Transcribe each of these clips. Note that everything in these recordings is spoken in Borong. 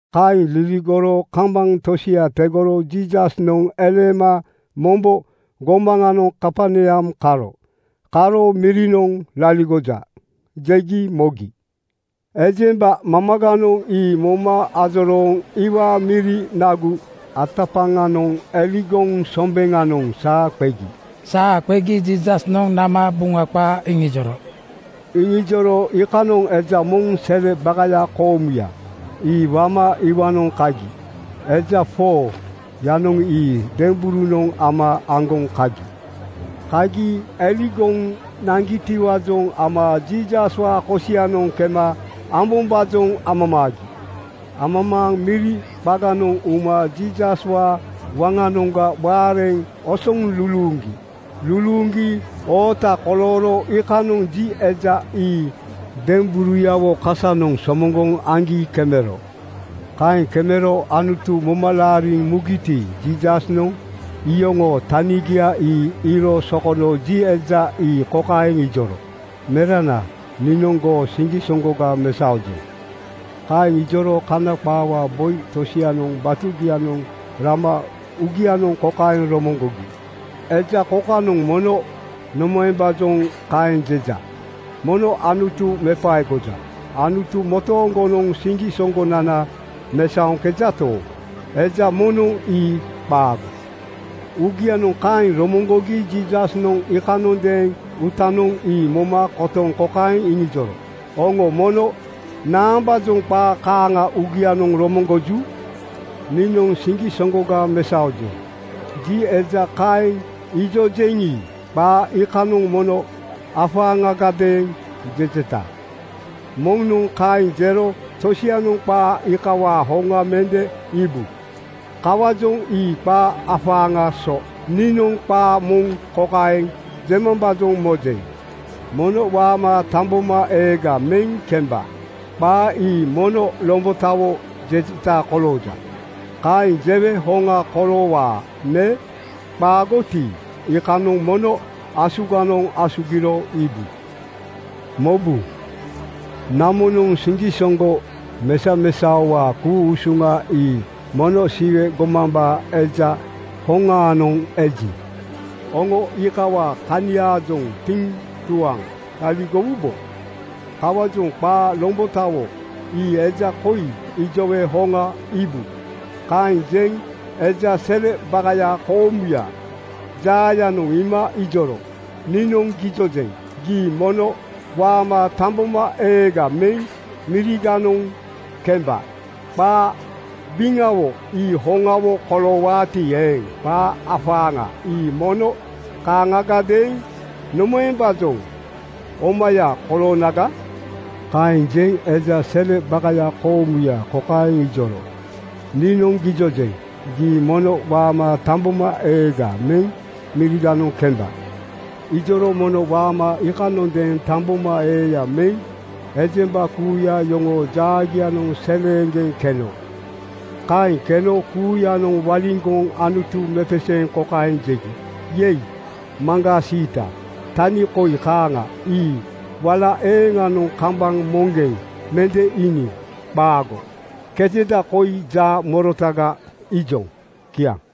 Kaeŋ liligoro kambaŋ tosia tegoro Jiisasnoŋ eleema mombo gomaŋanoŋ Kaperneam karo. Karo “Mirinoŋ laligoja,” jegi mogi. Ejemba mamaganoŋ ii moma ajorooŋ iwaa miri nagu atapaŋanoŋ eligoŋ sombeŋanoŋ saa qegi. Saa qegi Jiisasnoŋ nama Buŋa qaa iŋijoro. Iŋijoro iikanoŋ eja moŋ sele bakaya koomuya, ii wama iwaanoŋ kagi. Eja 4:yanoŋ ii demberunoŋ ama aŋgoŋ kagi. Kagi eligoŋ naŋgitiwaajoŋ ama Jiisaswaa kosianoŋ kema ambombaajoŋ amamaagi. Amamaaŋ miri qaganoŋ uma Jiisaswaa waŋanoŋga waareŋ osoŋ luluuŋgi. Luluuŋgi oota kolooro iikanoŋ ji eja ii demberuyawo kasanoŋ somoŋgoŋ aŋgi kemero. Kaeŋ kemero Anutu moma laariŋ mugiti, Jiisasnoŋ iyoŋoo tanigia ii iiro sokono ji eja ii kokaeŋ ijoro, “Merana, niinoŋ goo siŋgisoŋgoga mesaojeŋ.” Kaeŋ ijoro Kana qaawaa boi tosianoŋ batugianoŋ rama uugianoŋ kokaeŋ romoŋgogi, “Eja kokanoŋ mono nomaembaajoŋ kaeŋ jeja. Mono Anutu mepaegoja. Anutu motooŋgonoŋ siŋgisoŋgonana mesaoŋkejato, eja moŋnoŋ ii qaago.” Uugianoŋ kaeŋ romoŋgogi Jiisasnoŋ iikanondeeŋ uutanoŋ ii moma kotoŋ kokaeŋ iŋijoro, “Oŋo mono naambaajoŋ qaa kaaŋa uugianoŋ romoŋgoju? Niinoŋ ‘Siŋgisoŋgoga mesaojeŋ,’ ji eja kaeŋ ijojeŋi, qaa iikanoŋ mono afaaŋagadeeŋ jejeta. Moŋnoŋ kaeŋ jero tosianoŋ qaa iikawaa hoŋa mende iibu. Kawaajoŋ ii qaa afaaŋaa so. Niinoŋ qaa moŋ kokaeŋ jemambaajoŋ mojeŋ, ‘Mono waama tambomaeega meŋ kemba.’ Qaa ii mono lombotawo jejeta kolooja. Kaeŋ jewe hoŋa koloowaa me qaagoti, iikanoŋ mono asuganoŋ asugiro iibu. Mobu, namonoŋ siŋgisoŋgo mesamesaowaa ku-usuŋa ii mono Siwe gomambaa Eja hoŋaanoŋ eji, oŋo iikawaa kaniaajoŋ tiŋtuaŋ laligowubo. Kawaajoŋ qaa lombotawo ii eja koi ijowe hoŋa iibu,” Kaeŋ jeŋ eja sele bakaya koomuyaa jaayanoŋ iima ijoro, “Niinoŋ gijojeŋ: Gii mono waama tambomaeega meŋ miriganoŋ kemba. Qaa biŋawo ii hoŋawo koloowaati eeŋ, qaa afaaŋa ii mono kaaŋagadeeŋ nomaembaajoŋ omaya koloonaga?” Kaeŋ jeŋ eja sele bakaya koomuya kokaeŋ ijoro, “Niinoŋ gijojeŋ: Gii mono waama tambomaeega meŋ miriganoŋ kemba.” Ijoro mono waama iikanondeeŋ tambomaeeya meŋ ejemba kuuya yoŋoo jaagianoŋ seleeŋgeŋ keno. Kaeŋ keno kuuyanoŋ waliŋgoŋ Anutu mepeseeŋ kokaeŋ jegi, “Yei, maŋgaa siita! Tani koi kaaŋa ii wala eeŋanoŋ kambaŋ moŋgeŋ mende iiniŋ. Qaago! Keteda koi jaa morotaga iijoŋ.” Kiaŋ.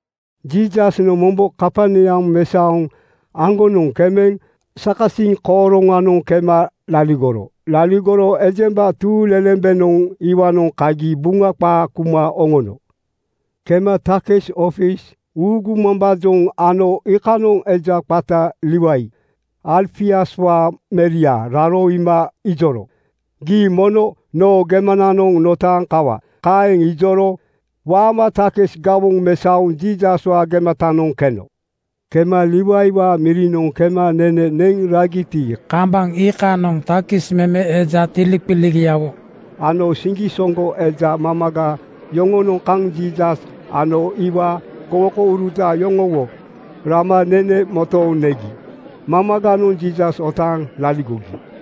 Jiisasnoŋ mombo Kaperneam mesaoŋ aŋgonoŋ kemeŋ sakasiŋ kooroŋanoŋ kema laligoro. Laligoro ejemba tuuŋlelembenoŋ iwaanoŋ kagi Buŋa qaa kuma oŋono. Kema takis ofis uugumambaajoŋ ano iikanoŋ eja qata Liwai Alfiuswaa meria raro iima ijoro, “Gii mono noo gemananoŋ notaaŋ kawa.” Kaeŋ ijoro waama takis gawoŋ mesaoŋ Jiisaswaa gematanoŋ keno. Kema Liwaiwaa mirinoŋ kema nene neŋ ragiti, kambaŋ iikanoŋ takis meme eja tiliqiligiawo ano siŋgisoŋgo eja mamaga yoŋonoŋ kaŋ Jiisas ano iwaa gowokouruta yoŋowo rama nene motooŋ negi. Mamaganoŋ Jiisas otaaŋ laligogi.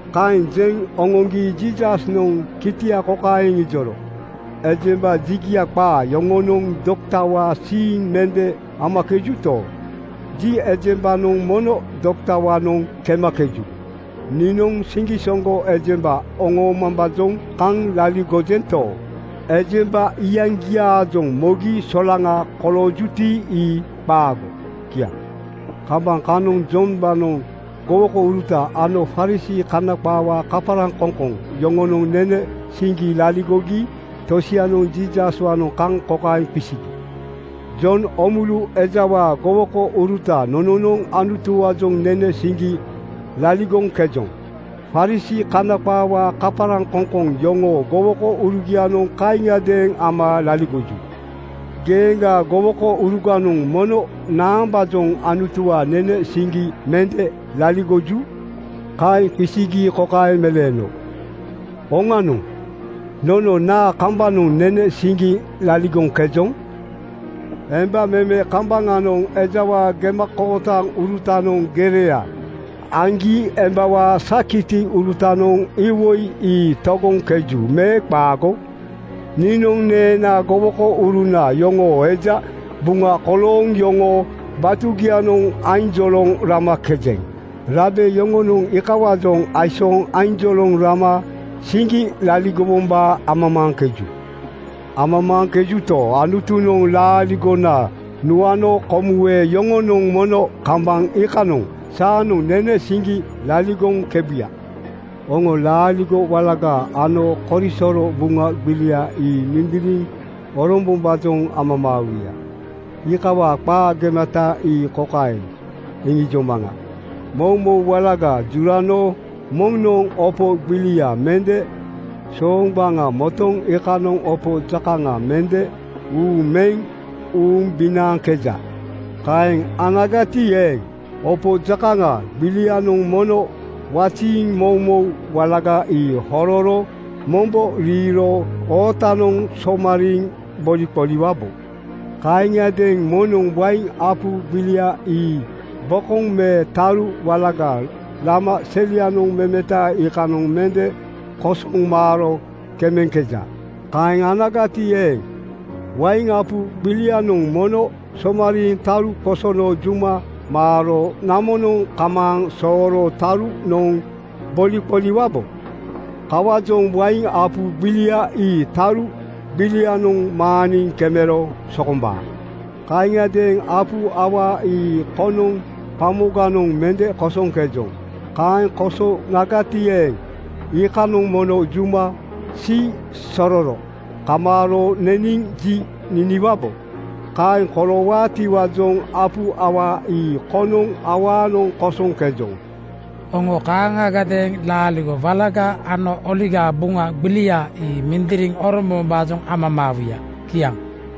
Kaeŋ jeŋ oŋoŋgi Jiisasnoŋ kitia kokaeŋ iŋijoro, “Ejemba jigia qaa yoŋonoŋ doktawaa siiŋ mende amakejuto, ji ejembanoŋ mono doktawaanoŋ kemakeju. Niinoŋ siŋgisoŋgo ejemba oŋoomambaajoŋ kaŋ laligojento, ejemba iyaŋgiaajoŋ mogi solaŋa koloojuti, ii qaago.” Kiaŋ. Kambaŋ kanoŋ Jombaanoŋ gowokouruta ano Farisii (Kana qaawaa kaparaŋkoŋkoŋ) yoŋonoŋ nene siŋgi laligogi tosianoŋ Jiisaswaanoŋ kaŋ kokaeŋ qisigi, “Jon Oomulu ejawaa gowokouruta nononoŋ Anutuwaajoŋ nene siŋgi laligoŋkejoŋ. Farisii (Kana qaawaa kaparaŋkoŋkoŋ) yoŋoo gowokourugianoŋ kaaŋiadeeŋ ama laligoju. Geeŋgaa gowokouruganoŋ mono naambaajoŋ Anutuwaa nene siŋgi mende laligoju?” Kaeŋ qisigi kokaeŋ meleeno, “Oŋanoŋ! Nono naa kambanoŋ nene siŋgi laligoŋkejoŋ? Emba meme kambaŋanoŋ ejawaa gemakootaŋurutanoŋ gereya aŋgi embawaa sakitiurutanoŋ iwoi ii togoŋkeju me qaago? Niinoŋ neenaa gowokouruna yoŋoo eja buŋa kolooŋ yoŋoo batugianoŋ ainjoloŋ ramakejeŋ. Rabe yoŋonoŋ iikawaajoŋ aisooŋ ainjoloŋ rama siŋgi laligowombaa amamaaŋkeju. Amamaaŋkejuto, Anutunoŋ laaligona nuano komuwe yoŋonoŋ mono kambaŋ iikanoŋ saanoŋ nene siŋgi laligoŋkebuya. “(Oŋo laaligo walaga ano korisoro Buŋa gbilia ii mindiriŋ orombombaajoŋ amamaawuya. Iikawaa qaa gemata ii kokaeŋ iŋijomaŋa.) Moumou walaga jurano moŋnoŋ opo gbilia mende sooŋgbaŋa motoŋ iikanoŋ opo jakaŋa mende uuŋ meŋ uumbinaaŋkeja. Kaeŋ anagati eeŋ, opo jakaŋa gbilianoŋ mono waziiŋ moumou walaga ii hororo mombo riiro ootanoŋ somariiŋ boliqoliwabo. Kaaŋiadeeŋ moŋnoŋ wain apu gbilia ii bokoŋ me taru walaga lama selianoŋ memeta iikanoŋ mende kosoŋ maaro kemeŋkeja. Kaeŋ anagati eeŋ, wain apu gbilianoŋ mono somariiŋ taru qosono juma maaro namonoŋ kamaaŋ sooro taruyanoŋ boliqoliwubo. Kawaajoŋ wain apu gbilia ii taru gbilianoŋ maaniŋ kemero sokombaa. (Kaaŋiadeeŋ apu awaa ii konoŋ gbamoganoŋ mende kosoŋkejoŋ. Kaeŋ kosowonagati eeŋ, iikanoŋ mono juma siisororo kamaaro neniŋ ji niniwabo. Kaeŋ koloowaatiwaajoŋ apu awaa ii konoŋ awaanoŋ kosoŋkejoŋ. Oŋo kaaŋagadeeŋ laaligo walaga ano Oligaa Buŋa gbilia ii mindiriŋ orombombaajoŋ amamaawuya.) Kiaŋ.”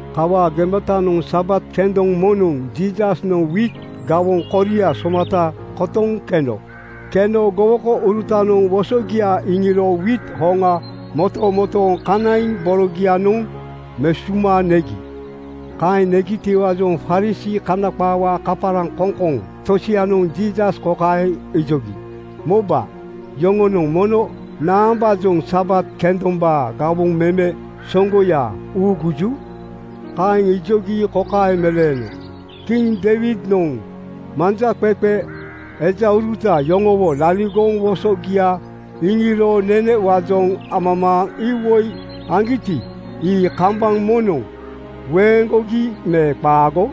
Kawaa gematanoŋ Sabat kendoŋ moŋnoŋ Jiisasnoŋ wiit gawoŋ koria somata kotoŋ keno. Keno gowokourutanoŋ wosogia iŋiro wiit hoŋa motomotooŋ kanaiŋ borogianoŋ mesuma negi. Kaeŋ negitiwaajoŋ Farisii (Kana qaawaa kaparaŋkoŋkoŋ) tosianoŋ Jiisas kokaeŋ ijogi, “Moba, yoŋonoŋ mono naambaajoŋ Sabat kendombaa gawoŋ meme soŋgoya uuguju?” Kaeŋ ijogi kokaeŋ meleeno, “Kiŋ Deiwidnoŋ manjaqeqe ejauruta yoŋowo liligoŋ wosogia iŋiro nenewaajoŋ amamaaŋ iwoi aŋgiti, ii kambaŋ moŋnoŋ weeŋgogi me qaago?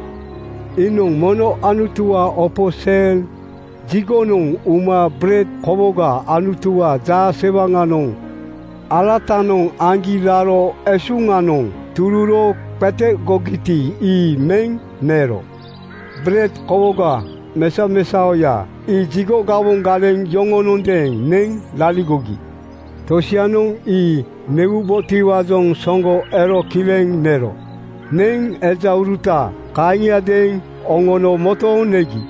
Iinoŋ mono Anutuwaa opo sel jigonoŋ uma bered kowoga Anutuwaa jaasewaŋanoŋ alatanoŋ aŋgi raro esuŋanoŋ tururo qetegogiti, ii meŋ nero. Bered kowoga mesamesaoya ii jigo gawoŋ galeŋ yoŋonondeeŋ neŋ laligogi. Tosianoŋ ii newubotiwaajoŋ soŋgo ero kileŋ nero. Neŋ ejauruta kaaŋiadeeŋ oŋono motooŋ negi.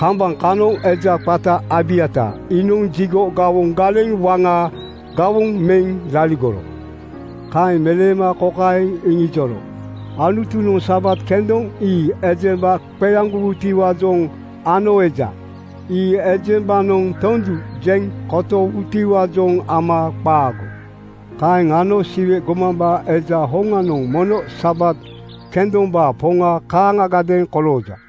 Kambaŋ kanoŋ eja qata Abiatar iinoŋ jigo gawoŋ galeŋ waŋaa gawoŋ meŋ laligoro.” Kaeŋ meleema kokaeŋ iŋijoro, “Anutunoŋ Sabat kendoŋ ii ejemba qeaŋgowutiwaajoŋ ano eja. Ii ejembanoŋ tondu jeŋ kotowutiwaajoŋ ama qaago! Kaeŋ ano Siwe gomambaa Eja hoŋanoŋ mono Sabat kendombaa Poŋa kaaŋagadeeŋ kolooja.”